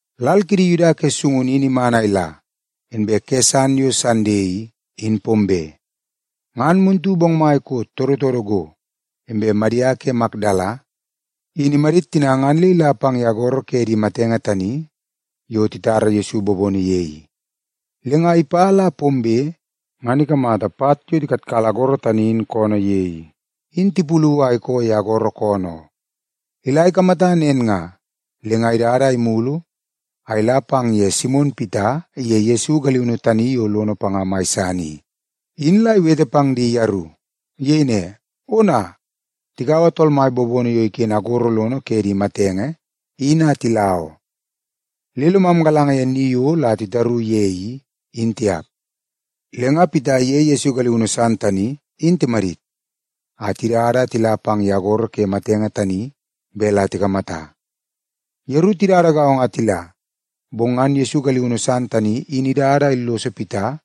Lal kidi Yuda ke sungunu in iman a ila, inbe ke san yo Sande i, in pombe. Ngan muntu bongmai koot todotodo go, inbe Madia ke Makdala in imadit tina ngan le ila pang ye agoro ke di matenge tani yo titara Yesu bobono ye i. Le nga ipa le la pombe ngan ikamata pat yo tikatkala agoro tani in koonoo ye i, in tipulu a ikoo ye agoro koonoo oo. Ila ikamata nen nga, le nga idada a imulu a ila pang ye Simon Pita iye Yesu galiunu tani yo lono panga mai san i, in la iwete pang di yeru. Iyei ne, “Ona, tikaua Tool Mai bobono yo iken agoro lono ke di matenge in a tila oo. Le lomam galanga ye ni yo la titaru ye i, in tiap.” Le nga Pita iye Yesu galiunu san tani in timadit a tidada a tila pang ye agoro ke di matenge tani bet la tikamata. Yeru tidada gaongo a tila, bong ngan Yesu galiunu san tani in idada a illoso Pita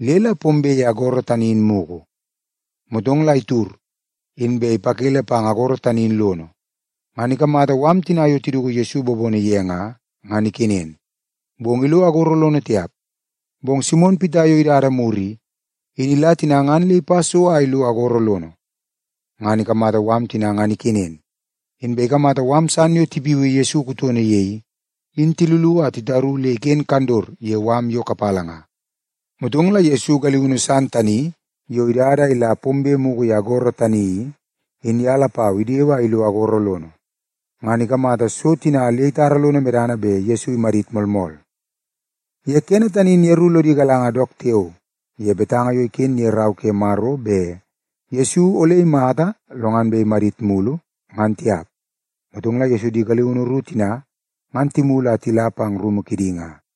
le la pombe ye agoro tani in mugu. Motong la itud, inbe ipakele pang agoro tani in lono, ngan ikamata mala tina yo tiduku Yesu bobono ye nga, ngan ikenen, bong ilo agoro lono tiap. Bong Simon Pita yo idada mur i, in ila tina ngan le ipa so a ilo agoro lono. Ngan ikamata mala tina ngan ikenen, inbe ikamata mala san yo tipiui Yesu kutono ye i, in tilulu a titaru le iken kandot ye mala yo kapala nga. Motong la Yesu galiunu san tani yo idada a ila pombe mugu ye agoro tani i, in ye lapau idewe a ilo agoro lono. Ngan ikamata so tina le itara lono medana bet Yesu imadit moolmool. (Ye kene tani in yeru lodi galanga dook tiao ye betanga yo iken ye Rau ke Maro bet Yesu ole imata lo ngan bet imadit mulu, ngan tiap.) Motong la Yesu di galiunu ru tina ngan timulu a tila pang rumu kidi nga.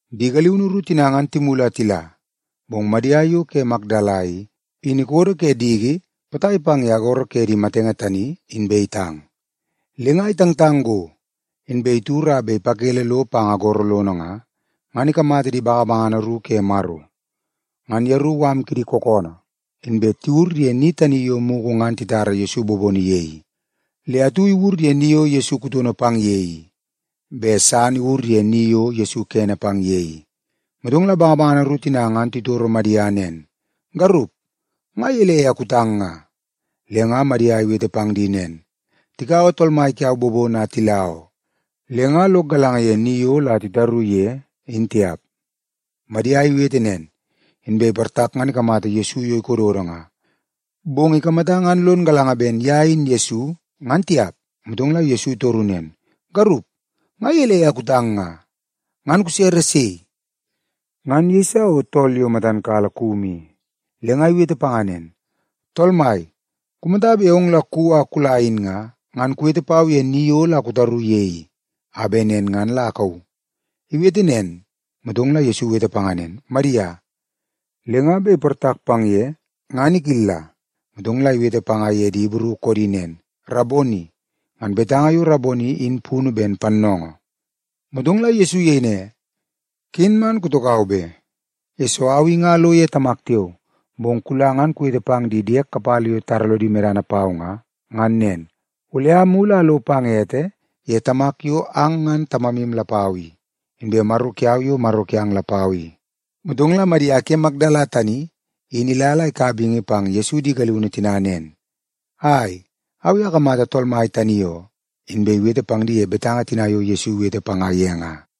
Di galiunu ru tina ngan timulu a tila, bong Madia yo ke Makdala i, in ikodo ke diki potai pang ye agoro ke di matenge tani, inbe itang. Le nga itangtang go, inbe itud a bet ipakele lo pang agoro lono nga, ngan ikamata di bangabangana ru ke Maro. Ngan yeru mala kidi kookoonoo, inbe tiwur ye ni tani yo mugu ngan titara Yesu bobono ye i. Le atu iwur ye ni yo Yesu kutono pang ye i, inbe san iwur ye ni yo Yesu kene pang ye i. Motong la di bangabangana ru tina ngan titoro Madia nen, “Garup, nga gelei a kutang nga?” Le nga Madia iwete pang di nen, “Tikaua Tool Mai kiau bobono a tila oo, le nga lok galanga ye ni yo la titaru ye, in tiap.” Madia iwete nen, inbe iportak ngan ikamata Yesu yo ikododo nga. Bong ikamata ngan lon galanga ben ye in Yesu, ngan tiap. Motong la Yesu itoru nen, “Garup, nga gelei a kutang nga? Ngan kusere sei?” Ngan iyeisa o tool yo matan kala kumu i, le nga iwete panga nen, “Tool mai, kumata bet ong la kuwi a kula in nga, ngan kuwete pau ye ni yo la kutaru ye i, a bet nen ngan la akauu.” Iwete nen, motong la Yesu iwete panga nen, “Madia.” Le nga bet iportak pang ye ngan ikilla, motong la iwete panga ye di Ibru koodi nen, “Raboni!” (Ngan betanga yo Raboni in punu ben Pannoongoo.) Motong la Yesu iyei ne, “Ken man kutokau be, yesoo au i nga alo ye Tamak tiao. Bong kula ngan kuwete pang di diek kapala yo titara lodi medana pau nga, ngan nen, ‘Ole amulu a alo pang ete ye Tamak yo ang ngan Tamamu lapau i, inbe Maro kiau yo Maro kiang lapau i.’” Motong la Madia ke Makdala tani in ila la ikaua bingi pang Yesu di galiunu tina ngan nen, “Ai, au i akamata Tool Mai tani oo!” Inbe iwete pang di ye betanga tina yo Yesu iwete panga ye nga.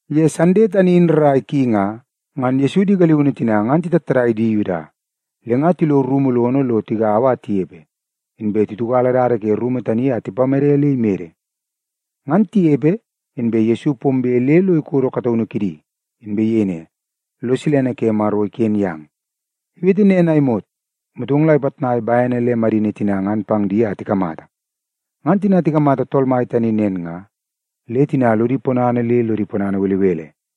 Ye Sande tani in rrai ki nga, ngan Yesu di galiunu tina ngan titattadai di Yuda, le nga tilo rumu lono lo tigaua a tinepe, inbe titiukala dada ke rumu tani a tipamede le imede. Ngan tinepe, inbe Yesu pombe le lo ikodo kataunu kidi, inbe iyei ne, “Lo silene ke Maro iken yang.” Iwete nen a imot, motong la ipitnai bene le madini tina ngan pang di a tikamata. Ngan tina tikamata Tool Mai tani nen nga, le tina lodi ponana le lodi ponana belebele.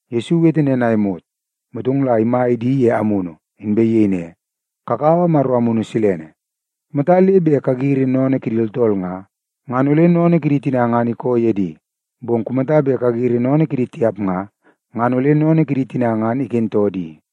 Yesu iwete nen a imot, motong la imai di ye amunu, inbe iyei ne, “Kakaua Maro Amunu Silene. Kumata le bet kagiri sennene kidi tooltool nga, ngan ole sennene kidi tina ngan ikoo ye di. Bong kumata bet kagiri sennene kidi tiap nga, ngan ole sennene kidi tina ngan ikentoo di.”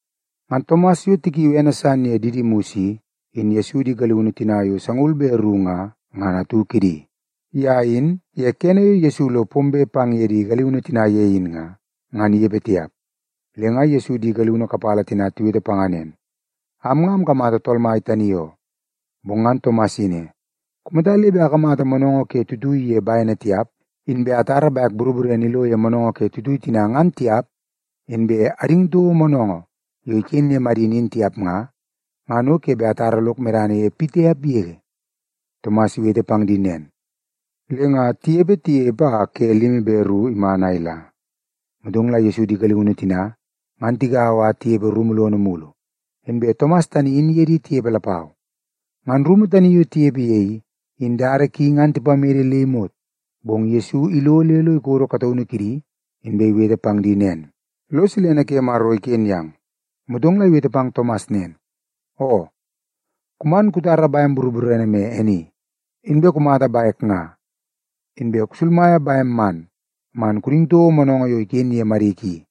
Ngan Tomas yo tikiui ene san ye Didimus i, in Yesu di galiunu tina yo sangaul be ru nga, ngan atu kidi. Ye in, ye kene yo Yesu lo pombe pang ye di galiunu tina ye in nga, ngan inepe tiap. Le nga Yesu di galiunu kapala tina tiwete panga nen, “Am nga amkamata Tool Mai tani oo.” Bong ngan Tomas iyei ne, “Kumata le bet akamata moonoongoo ke tuitui ye bene tiap, inbe atara bek boroborene ilo ye moonoongoo ke tuitui tina ngan tiap inbe ading toko moonoongoo yo iken ke madini in tiap nga, ngan o ke bet atara lok medana ye pitiap yege.” Tomas iwete pang di nen, le nga tinepe tinepe a ke limi be ru iman a ila, motong la Yesu di galiunu tina ngan tigaua a tinepe rumu lono mulu. Inbe Tomas tani in iye di tinepe lapau. Ngan rumu tani yo tinepe ye i, in dada ki ngan tipamede le imot, bong Yesu ilo le lo ikodo kataunu kidi, inbe iwete pang di nen, “Lo silene ke Maro iken yang.” Motong la iwete pang Tomas nen, “Oo, kuman kutara bem boroborene me e ni. Inbe kumata bek nga. Inbe kusulmaia bem man, man kuding toko moonoongoo yo iken ye madik i.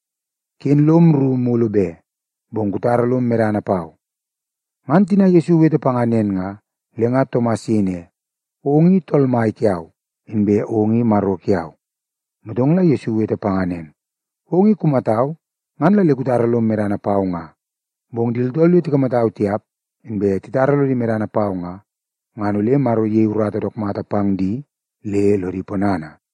Ken lom rru mulu be, bong kutara lom medana pau.” Ngan tina Yesu iwete panga nen nga, le nga Tomas iyei ne, “Ong i Tool Mai kiau, inbe ong i Maro kiau.” Motong la Yesu iwete panga nen, “Ong i kumatau, ngan la le kutara lom medana pau nga. Bong di tooltool yo tikamatau tiap, inbe titara lodi medana pau nga, ngan ole Maro iyei urata dook mata pang di le lodi ponana.”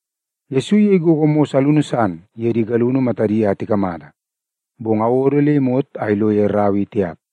Yesu iyei gogo mos alunu san ye di galiunu matadi a tikamata, bong awodo le imot a ilo ye rau i tiap.